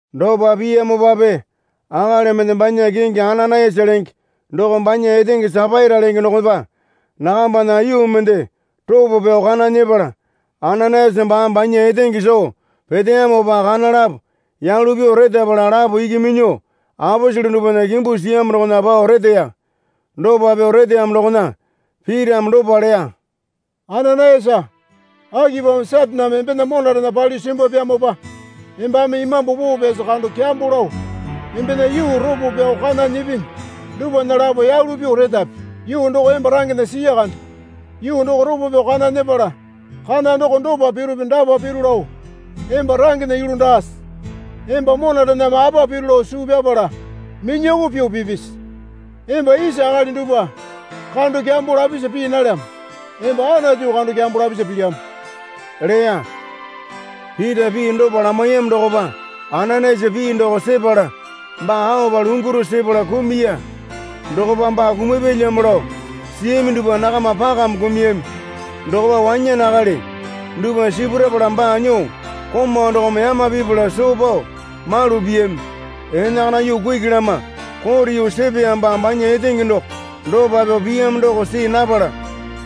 Dopa piyamopape akali mende banya kingi Ananayasa lenge doko banya etenge Sapaira lenge dokopa nakambana yuu mende ropo pyao kana nyepala Ananayasa baame banya etenge soo peteyamopa kana lapo yalu pyuo retapala lapo iki minyuo aposele dupwana kimbu siyamo dokona pao reteya. Dopa pyuo reteyamo dokona Pitame dopa leya. Ananayasa, Akipamo Sataneme embena monarena palyuo simbwapyamopa embame Imambu Poo Pyasi kando kyambo lao embena yuu ropo pyao kana nyipinyi dupwana lapo yalu pyuo retapi? Yuu doko emba rangena siya kande. Yuu doko ropo pyao kana nyepala kana doko dopa pirupi dapa piru lao emba rangena yulu daase? Emba monarename apa piru lao suu pyapala minyoko pyuo pipisi? Emba isa akali dupwa kando kyambo lapisa pii nalyamo. Emba Anatu kando kyambo lapisa pilyamo leya. Pita pii dopa lamaiyamo dokopa Ananayasa pii doko sepala baa aopa lunguru sepala kumuya. Dokopa baa kumapyalyamo lao siyami dupwa nakama pakame kumuyami. Dokopa wanyane akali dupwa sipurapala baa nyuo komau dokome yama pipala soo pao malu piyami. Enakana yuu kuki lama kote yuu sepeyamopa banya etenge doko dopa pyuo piyamo doko see napala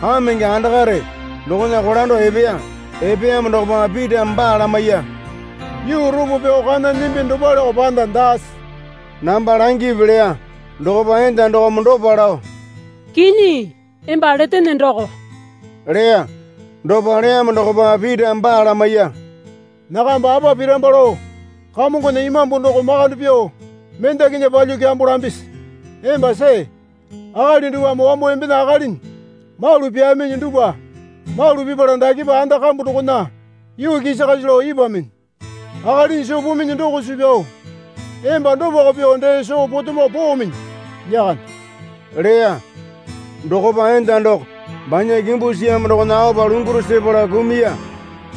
kamenge andakare dokona kolando epeya. Epeyamo dokopa Pitame baa lamaiya. Yuu ropo pyao kana nyimbi dopaleko panda daase? namba langipi leya. Dokopa enda dokome dopa lao, Kinyi emba letene doko leya. Dopa leyamo dokopa Pitame baa lamaiya. Nakamba apa piramba lao Kamongona Imambu doko makande pyuo mendakinya palyuo kyambo lambisi? Emba see. Akali dupwame wambo embena akalinya malu pyaaminyi dupwa malu pipala dakepa anda kambu dokona yuu kisakasi lao ipwuaminyi. Akalinyi soo puminyi doko suu pyao emba dopako pyuo dee soo potomo poominyi lyakande leya. Dokopa enda doko banya kimbu siyamo dokona aopa lunguru sepala kumuya.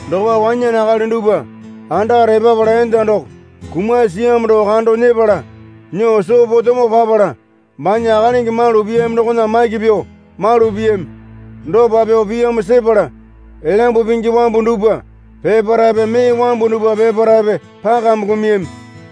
Dokopa wanyane akali dupwa andakare epapala enda doko kumasi siyamo doko kando nyepala nyuo soo potomo papala banya akalingi malu piyami dokona maki pyuo malu piyami. Dopa pyuo piyamo sepala Elyambu Pingi wambu dupwa peparaepe mee wambu dupwa peparaepe pakame kumuyami.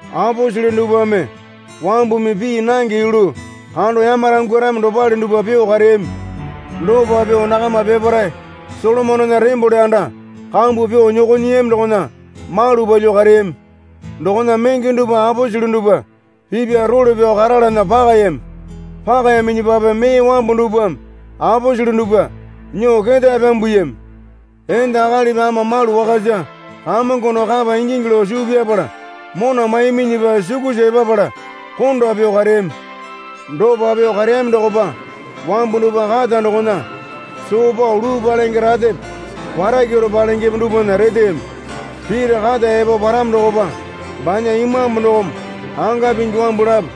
Aposele dupwame wambumi pii nange yulu kando yamarangwarami dopale dupwa pyuo kareyami. Dopa pyuo nakama peparae Solomonena tembole anda kambu pyuo nyoko nyiyami dokona malu palyuo kareyami. Dokona menge dupwa aposele dupwa pipya role pyao karalana pakayami. Pakayaminyipape mee wambu dupwame aposele dupwa nyuo ketae pyambuyami. Enda akalipi ama malu wakasa Kamongo doko kapa ingingi lao suu pyapala mona maiyaminyipa sukusa epapala konda pyuo kareyami. Dopa pyuo kareyami dokopa wambu dupwa kata dokona soo pao luu palenge ratepe warakyaro palengepe dupwana reteyami. Pita kata epo paramo dokopa banya imambu dokome anga pingi wambu lapo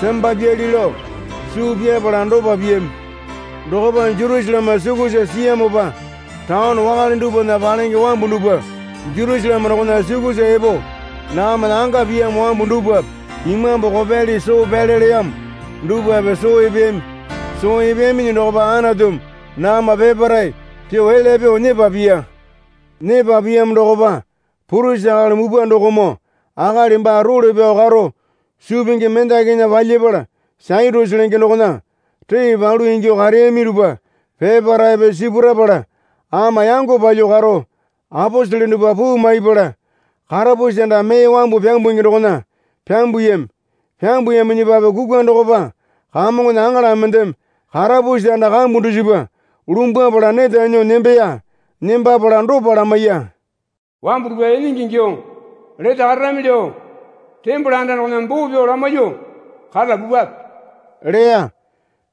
sembapyali lao suu pyapala dopa piyami. Dokopa Jerusaleme sukusa siyamopa taone wakale dupwana palenge wambu dupwa Jerusaleme dokona sukusa epo nakamana anga piyamo wambu dupwape imambu kopyali soo pyale leyamo dupwape soo epeyami. Soo epeyaminyi dokopa Anatumi nakama peparae pyuo elya pyuo nyepa piya. Nyepa piyamo dokopa purisi akali mupwa dokomoo akali baa role pyao karo suu pingi mendakinya palyapala Satyusi lenge dokona ree palu ingyuo kareyami dupwa peparaepe sipurapala ama yango palyuo karo aposele dupwa puu maipala karapusi anda mee wambu pyambungi dokona pyambuyami. Pyambuyaminyipape kukwa dokopa Kamongona aŋala mendeme karapusi anda kambu dusipa lumbwapala neta nyuo nembeya. Nembapala dopa lamaiya. Wambu dupwa enenge ingyuo lete kararami lao tembole anda dokona boo pyao lamaiyuo karala pupwape leya.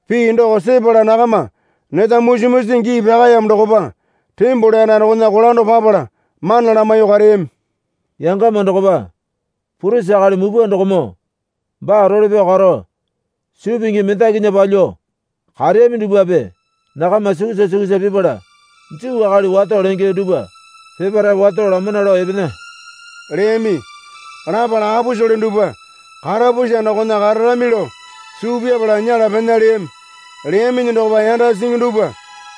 Pii doko sepala nakama neta musi musi gii pyakaeyamo dokopa tembole anda dokona kolando papala mana lamaiyuo kareyami. Yangama dokopa purisi akali mupwa dokomoo baa role pyao karo suu pingi mendakinya palyuo kareyami dupwape nakama sukusa sukusa pipala Juu akali wato lenge duwpa peparae wato lamana lao epena leyami. Lapala aposele dupwa karapusi anda dokona kararami lao suu pyapala nyela pena leyami. Leyaminyi dokopa yanda singi dupwa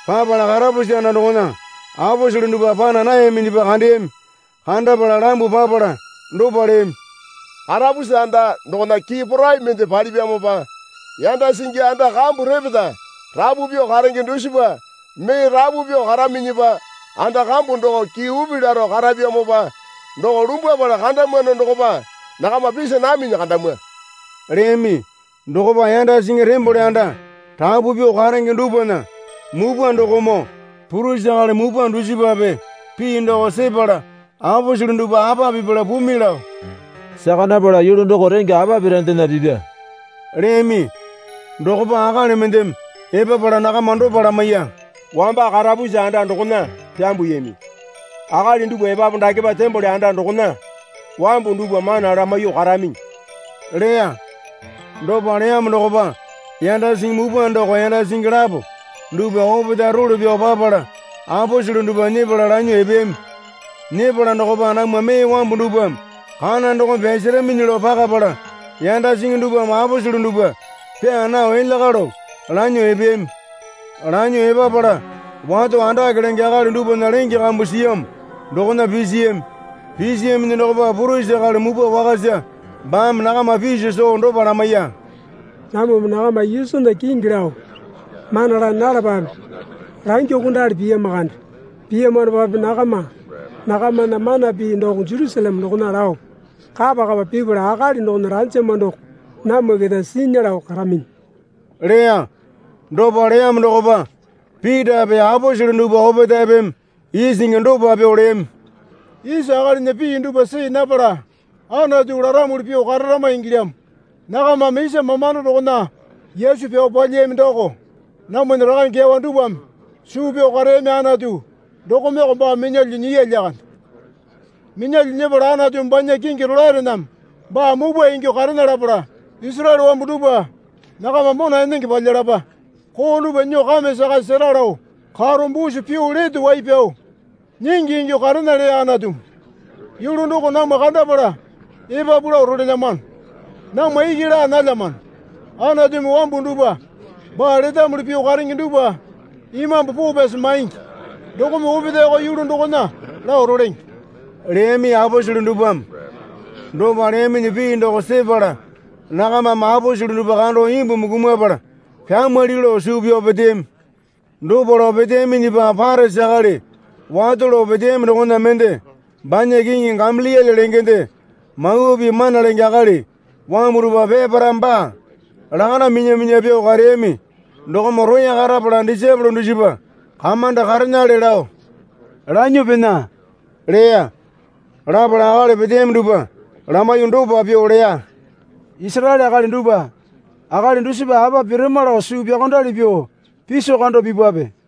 papala karapusi anda dokona aposele dupwa pana nayaminyipa kandeyami. Kandapala lambuo papala dopa leyami. Karapusi anda dokona kii porai mende palipyamopa yanda singi anda kambu repeta rapu pyuo karenge dusipa mee rapu pyuo karaminyipa anda kambu doko kii upi laro karapyamopa doko lumbwapala kandamwano dokopa nakama pisi naminyi kandamwa, leyami. Dokopa yanda singi tembole anda rapu pyuo karenge dupwana mupwa dokomoo purisi akali mupwa dusipape pii doko sepala aposele dupwa apa pipala pumi lao saka napala yulu doko rengya apa pirandena pipya leyami. Dokopa akali mendeme epapala nakama dopa lamaiya. Wamba karapusi anda dokona pyambwami akali dupwa epapu dakepa tembole anda dokona wambu dupwa mana lamaiyuo karaminyi, leya. Dopa leyamo dokopa yanda singi mupwa doko yanda singi lapo dupwa opetae role pyao papala aposele dupwa nyepala lanyuo epeyami. Nyepala dokopa namwa mee wambu dupwame kana dokome pyasaraminyi lao pakapala yanda singi dupwame aposele dupwa pyaa nao elya kalo lanyuo epeyami. Lanyuo epapala wato andake lenge akali dupwana lenge kambu siyamo dokona pisiyami. Pisiyaminyi dokopa purisi akali mupwa wakasa baame nakama piso soo dopa lamaiya. Namwame nakama Yesunya kingi lao mana laa nalapape langyuokondali piyama kande. Piyamanopape nakama nakamana mana pii doko Jerusaleme dokona lao kapa kapa pipala akali dokona ranjama doko namwa keta sinya lao karaminyi leya. Dopa leyamo dokopa Pitape aposele dupwa opetaepeme isingi dopa pyuo leyami. Isa akalinya pii dupwa see napala Anatu laramuli pyuo kararama ingilyamo. Nakamame isa mamando dokona Yesu pyao palyiyami doko namwana rakange kyawa dupwame suu pyao kareyami Anatu dokomeko baa minyalyuo nyiya lyakande. Minyalyuo nyepala Anatumi banya kingi rolaerename baa mupwa ingyuo karena lapala Isaraele wambu dupwa nakama mona enenge palyalapa, koo dupwa nyuo kame sakasi sera lao karo busu pyuo baa Lete Wai Pyao Nyingi ingyuo karena leya Anatumi. Yulu doko namwa kandapala epapu lao rolelyamano. Namwa iki laa nalyamano. Anatumi wambu dupwa baa letamuli pyuo karenge dupwa Imambu Poo Pyasi maingi dokome opetaeko yulu dokona lao rolenge, leyami aposele dupwame. Dopa leyaminyi pii doko sepala nakamame aposele dupwa kando imbumi kumapala pyamwali lao suu pyao peteyami. Dopa lao peteyaminyipa Parisi akali wato lao peteyami dokona mende banya kingi Gamaliele lengende Mawa Pii mana lenge akali wambu dupwa peparaeme baa lakanda minya minya pyuo kareyami dokome roya karapala disaepole dusipa kamanda karenale lao lanyuo pena leya. Lapala akali peteyami dupwa lamaiyuo dopa pyuo leya. Isaraele akali dupwa, akali dusipa apa pirama lao suu pyaokondali pyuo piso kando pipwape.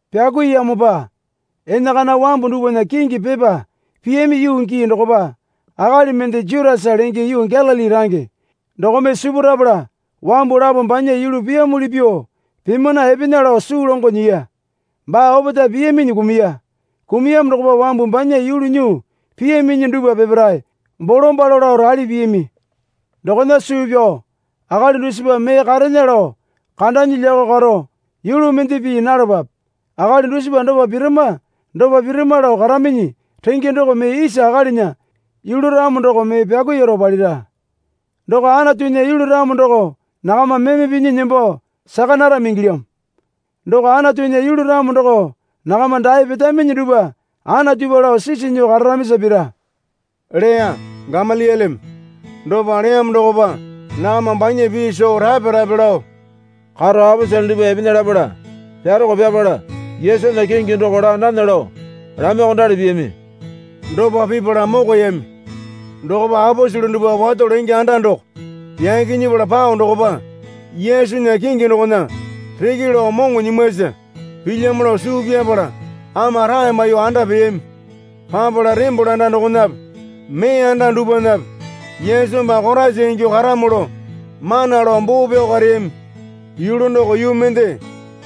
Pyakuiyamopa enakana wambu dupwana kingi pepa piyami yuu gii dokopa akali mende Jutasa lenge yuu Galili range dokome sipurapala wambu lapo banya yulu piyamuli pyuo pimana epena lao suu longo nyiya. Baa opetae piyaminyi kumuya. Kumuyamo dokopa wambu banya yulu nyuo piyaminyi dupwa peparae bolombalo lao rali piyami. Dokona suu pyao akali dusipa mee karena lao kandanyi lyakao karo yulu mende pii nalapape. Akali dusipa dopa pirama dopa pirama lao karaminyi renge doko mee isa akalinya yulu ramo doko mee pyakuiyaro palira. Doko Anatunya yulu ramo doko nakama meme pinya nembo saka narami ingilyamo. Doko Anatunya yulu ramo doko nakama dae petaminyi dupwa Anatupa lao sisi nyuo kararamisa pira, leya Gamalieleme. Dopa leyamo dokopa nakama banya pii soo rape rape lao karo aposele dupwa epena lapala pyaroko pyapala Yesunya kingi doko laa nana lao lamaiyuokondali piyami. Dopa pipala mokoyami. Dokopa aposele dupwa wato lenge anda doko yaki nyepala pao dokopa Yesunya kingi dokona reke lao moŋo nyimwasa pilyamo lao suu pyapala ama rae maiyuo anda peyami. Papala tembole anda dokonape mee anda dupwanape Yesu baa Koraisa ingyuo karamo lao mana lao boo pyao kareyami. Yulu doko yuu mende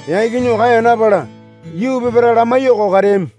yaki nyuo kaeya napala yuu peparae lamaiyuoko kareyami.